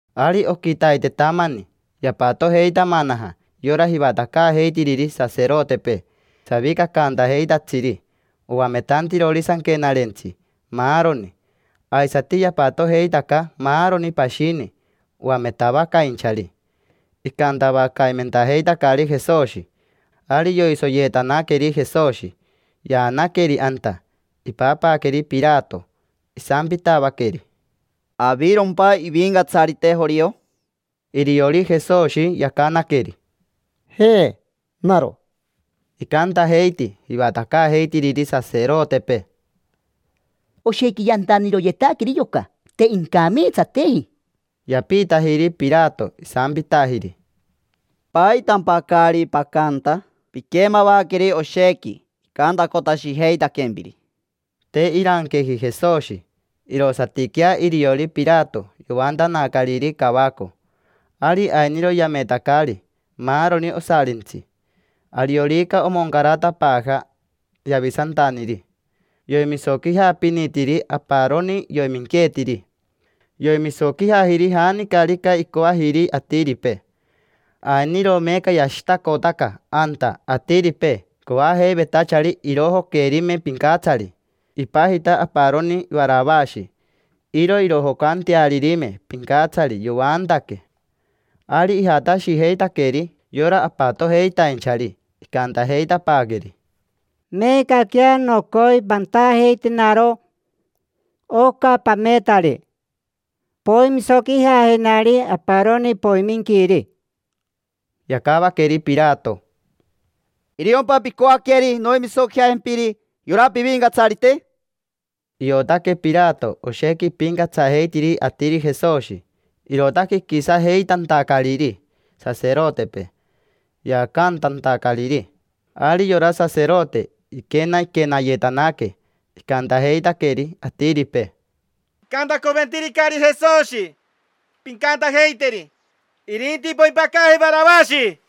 Ari oquitaitetamani, yapatojeitamanaja yora jivatacaajeitiriri saserotepee, savicacaantajeitatsiri, oametantirori sanquenarentsi, maaroni. Aisati yapatojeitaca maaroni pashini oametavacainchari. Icantavacaimentajeitacari Jesoshi. Ari yoisoyeetanaqueri Jesoshi, yaanaqueri anta, ipapaaqueri Pirato. Isampitavaqueri: —¿Avirompa ivincatsarite jorio? Iriori Jesoshi yacanaqueri: —Je, naro. Icantajeiti jivatacaajeitiriri saserotepee: —Oshequi yantaniroyetaqueri yoca, te incameetsateji. Yapiitajiri Pirato, isampitajiri: —¿Paitampa caari pacanta? Piquemavaqueri oshequi icantacotashijeitaquempiri. Te iranqueji Jesoshi. Irosatiquea iriori Pirato yoantanacariri cavaco. Ari ainiro yametacari: maaroni osarintsi, ariorica omoncaratapaaja yavisantaniri, yoimisoquijapinitiri aparoni yoiminqueetiri. Yoimisoquijajiri janicarica icoajiri atiripee. Ainiro meeca yashitacotaca anta atiripee coajeivetachari irojoquerime pincatsari: ipajita aparoni Varavashi. Iro irojocantearimeri pincatsari, yoantaque. Ari ijatashijeitaqueri yora apatojeitainchari, icantajeitapaaqueri: —Meecaquea nocoi pantajeitenaro oca pametari: poimisoquijajenari aparoni poiminquiri. Yacavaqueri Pirato: —¿Iriompa picoaqueri noimisoquijajempiri yora pivincatsarite? Iotaque Pirato oshequi ipincatsajeitiri atiri Jesoshi, irootaque iquisajeitantacariri saserotepee, yaacantantacariri. Ari yora saserote iquenaquenayetanaque, icantajeitaqueri atiripee: —Picantacoventiricari Jesoshi. Pincantajeiteri: “Irinti poimpacaajeri Varavashi”.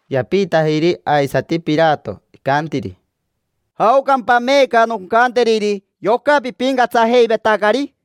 Yapiitajiri aisati Pirato, icantiri: —¿Jaocampa meeca noncanteriri yoca pipincatsajeivetacari?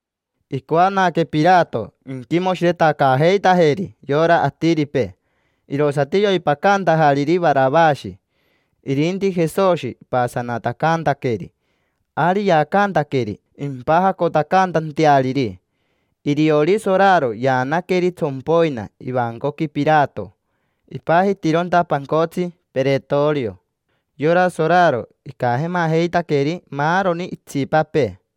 Icoanaque Pirato inquimoshiretacaajeitajeri yora atiripee, irosati yoipacantajariri Varavashi. Ja irintini Jesoshi ipasanatacantaqueri, ari yaacantaqueri impajacotacantanteariri. Iriori soraro yaanaqueri tsompoina ivancoqui Pirato. Ipajitironta pancotsi peretorio. Yora soraro icajemajeitaqueri maaroni itsipapee.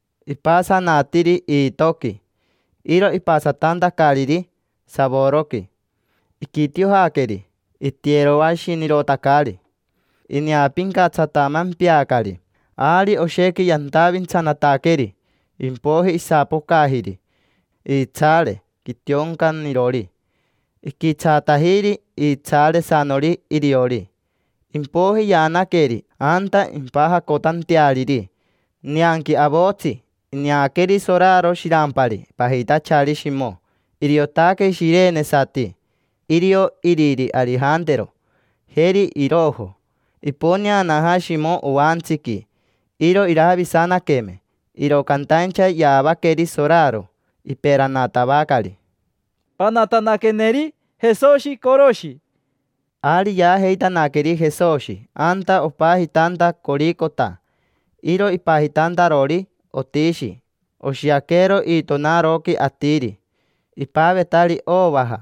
Ipasanatiri iitoqui, iro ipasatantacariri savoroqui. Iquitiojaqueri. Itiyeroashinirotacari, ineapincatsatamempeacari. Ari oshequi yantavintsanataqueri, impoiji isapocajiri iitsaare quitioncanirori, iquitsaatajiri iitsaaresanori iriori. Impoiji yaanaqueri anta impajacotanteariri. Nianqui avotsi ineaqueri soraro shirampari pajitachari Shimo, iriotaque shirenesati. Irio iriri Arijantero, jeri Irojo. Iponeanaja Shimo oantsiqui, iro iravisanaqueme, iro cantaincha yaavaqueri soraro, iperanatavacari: —Panatanaqueneri Jesoshi coroshi. Ari yaajeitanaqueri Jesoshi anta opajitanta Coricota. Iro ipajitantarori otishi oshiaquero iitonaroqui atiri. Ipavetari ovaja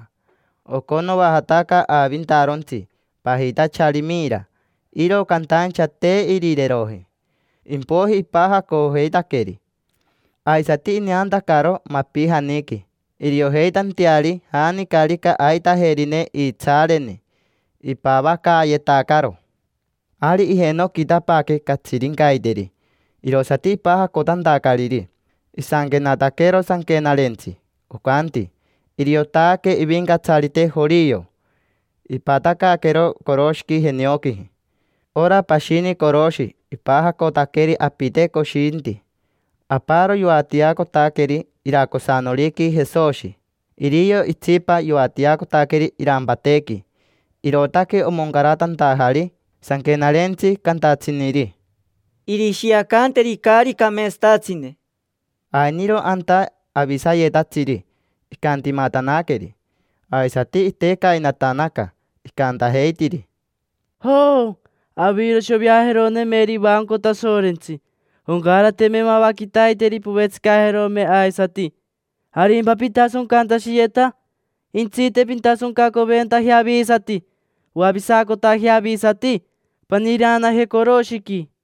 oconoajataca aavintarontsi pajitachari mira. Iro cantaincha te irireeroji. Impoiji ipajacojeitaqueri, aisati ineantacaro mapijaniqui, iriojeitanteari janicarica aitajerineri iitsaareni. Ipavacaayetacaro. Ari ijenoquitapaaque catsirincaiteri, irosati ipajacotantacariri. Isanquenataquero sanquenarentsi, ocanti: “Iriotaque ivincatsarite jorio”. Ipatacaaquero coroshiqui jenioquiji. Ora pashini coroshi ipajacotaqueri apite coshinti. Aparo yoatiacotaqueri iracosanoriqui Jesoshi, irio itsipa yoatiacotaqueri irampatequi. Irootaque omoncaratantajari sanquenarentsi cantatsiniri: “Irishiacanteri caari cameetsatatsine”. Ainiro anta avisayetatsiri icantimatanaqueri, aisati yavimacanaca, icantajeitiri: —Joo, aviro shoveajeronemeri ivanco Tasorentsi. Oncarateme mava quitaiteri povetsicajerome aisati. ¿Arimpa pitasoncantashiyeta? Jentsite, pintasoncacoventajea avisati: poavisacotajea avisati, paniireanaje coroshiqui.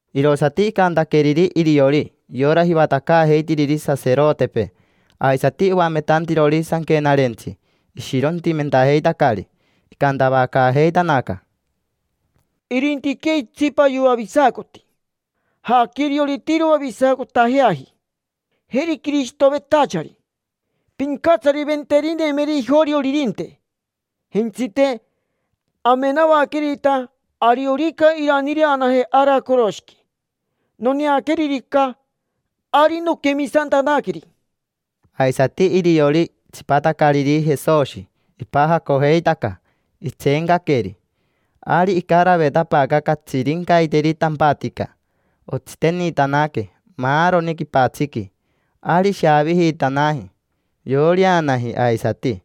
Irosati icantaqueriri iriori yora jivatacaajeitiriri saserotepee, aisati oametantirori sanquenarentsi. Ishirontimentajeitacari, icantavacaajeitanaca: —Irintiquea itsipa yoavisacoti. Jaaquea iriori te iroavisacotajeaji. Jeri Quirishitovetachari, pincatsariventerinemeri ijorioririnte. Jentsite, amenavaquerita ariorica iraniireanaje ara coroshiqui. Noneaqueririca, ari nonquemisantanaqueri. Aisati iriori tsipatacariri Jesoshi ipajacojeitaca, itseencaqueri. Ari icaravetapaaca catsirincaiteri tampatica, otsitenitanaque maaroni quipatsiqui. Ari ishavijitanaji, iporeanaji aisati.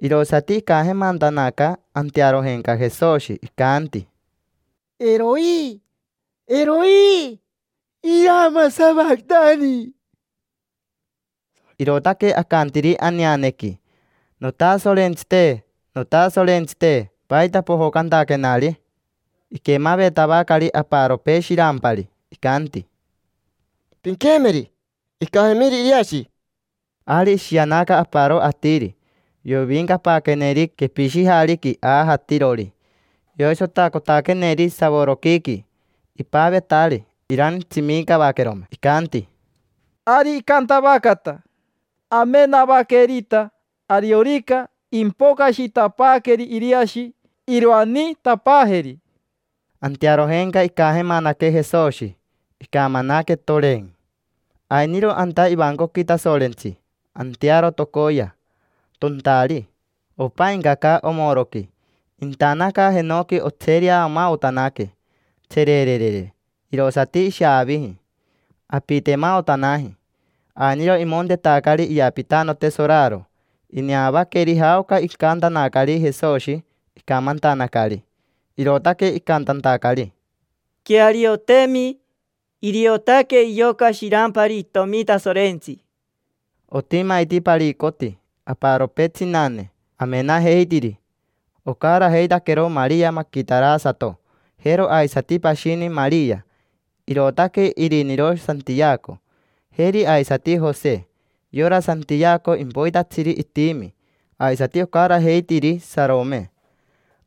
Irosati icajemantanaca antearojenca Jesoshi, icanti: —Eroi, Eroi, irama savatani. Irootaque acantiri aneanequi: “Notasorentsite. Notasorentsite. ¿Paita pojocantaquenari?” Iquemavetavacari aparopee shirampari, icanti: —Pinquemeri, icajemiri Iriashi. Ari ishianaca aparo atiri, yoviincapaaqueneri quepishijariqui aajatirori. Yoisotacotaqueneri savoroquiiqui. Ipavetari irantsimicavaquerome. Icanti: —Ari icantavacata: amenavaquerita ariorica impocashitapaaqueri Iriashi iroaniitapaajeri. Antearojenca icajemanaque Jesoshi, icamanaque, toren. Ainiro anta ivancoqui Tasorentsi antearo tocoya, tontari, opaincaca omoroqui. Intanaca jenoqui otsereamaotanaque, tsererere, irosati ishaaviji. Apitemaotanaji. Ainiro imontetacari iyapitanote soraro. Ineavaqueri jaoca icantanacari Jesoshi, icamantanacari. Irootaque icantantacari: —Quearioteemi: iriotaque yoca shirampari itomi Tasorentsi. Otimaiti paricoti aparopee tsinane, amenajeitiri. Ocarajeitaiti Maria Maquitarasato, jero aisati pashini Maria, irootaque iriniro Santiaco, jeri aisati Jose. Yora Santiaco impoitatsiri itimi. Aisati ocarajeitiri Sarome.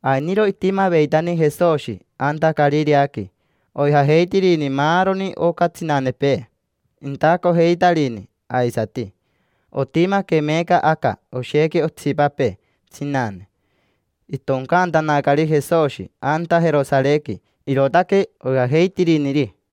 Ainiro itimaveitani Jesoshi anta Carireaqui, oijajeitirini maaroni oca tsinanepee. Intacojeitarini aisati. Otimaque meeca aca oshequi otsipapee tsinane. Itoncaantanacari Jesoshi anta Jerosarequi, irootaque oijajeitiriniri.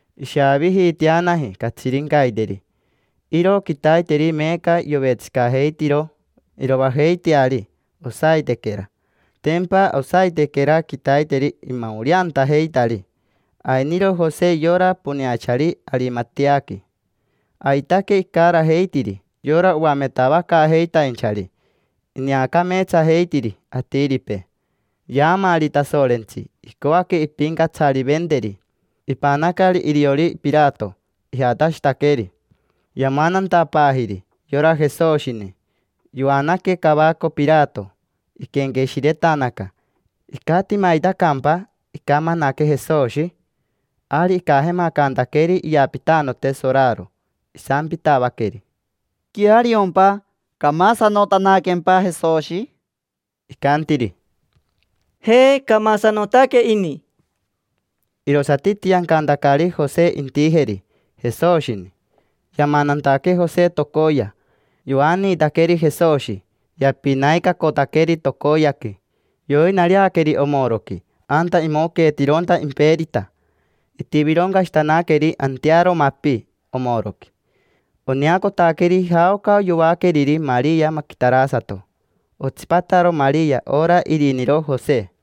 Ishavijiiteanaji catsirincaiteri. Iro quitaiteri meeca yovetsicajeitiro iroajeiteari osaitequera, tempa osaitequera quitaiteri imaoreantajeitari. Ainiro Jose, yora poneachari Arimateaqui. Aitaque icarajeitiri yora oametavacaajeitainchari. Ineacameetsajeitiri atiripee. Yaamaari Tasorentsi, icoaque impincatsariventeri. Ipanacari iriori Pirato, ijatashitaqueri yamanantapaajiri yora Jesoshini. Yoanaque cavaco Pirato. Iquenqueshiretanaque: “¿Icatimaitacampa icamanaque Jesoshi?” Ari icajemacantaqueri iyapitanote soraro. Isampitavaqueri: —¿Queariompa? ¿Camasanotanaquempa Jesoshi? Icantiri: —Je, camasanotaque ini. Irosati itiancantacariri Jose intijeri Jesoshini. Yamanantaque Jose tocoya. Yoaniitaqueri Jesoshi, yapinaicacotaqueri tocoyaqui. Yoiponaaqueri omoroqui, anta imoqueetironta imperita. Itivironcashitanaqueri antearo mapi omoroqui. Oneacotaqueri jaoca yoaqueriri Maria Maquitarasato. Otsipataro Maria, ora iriniro Jose.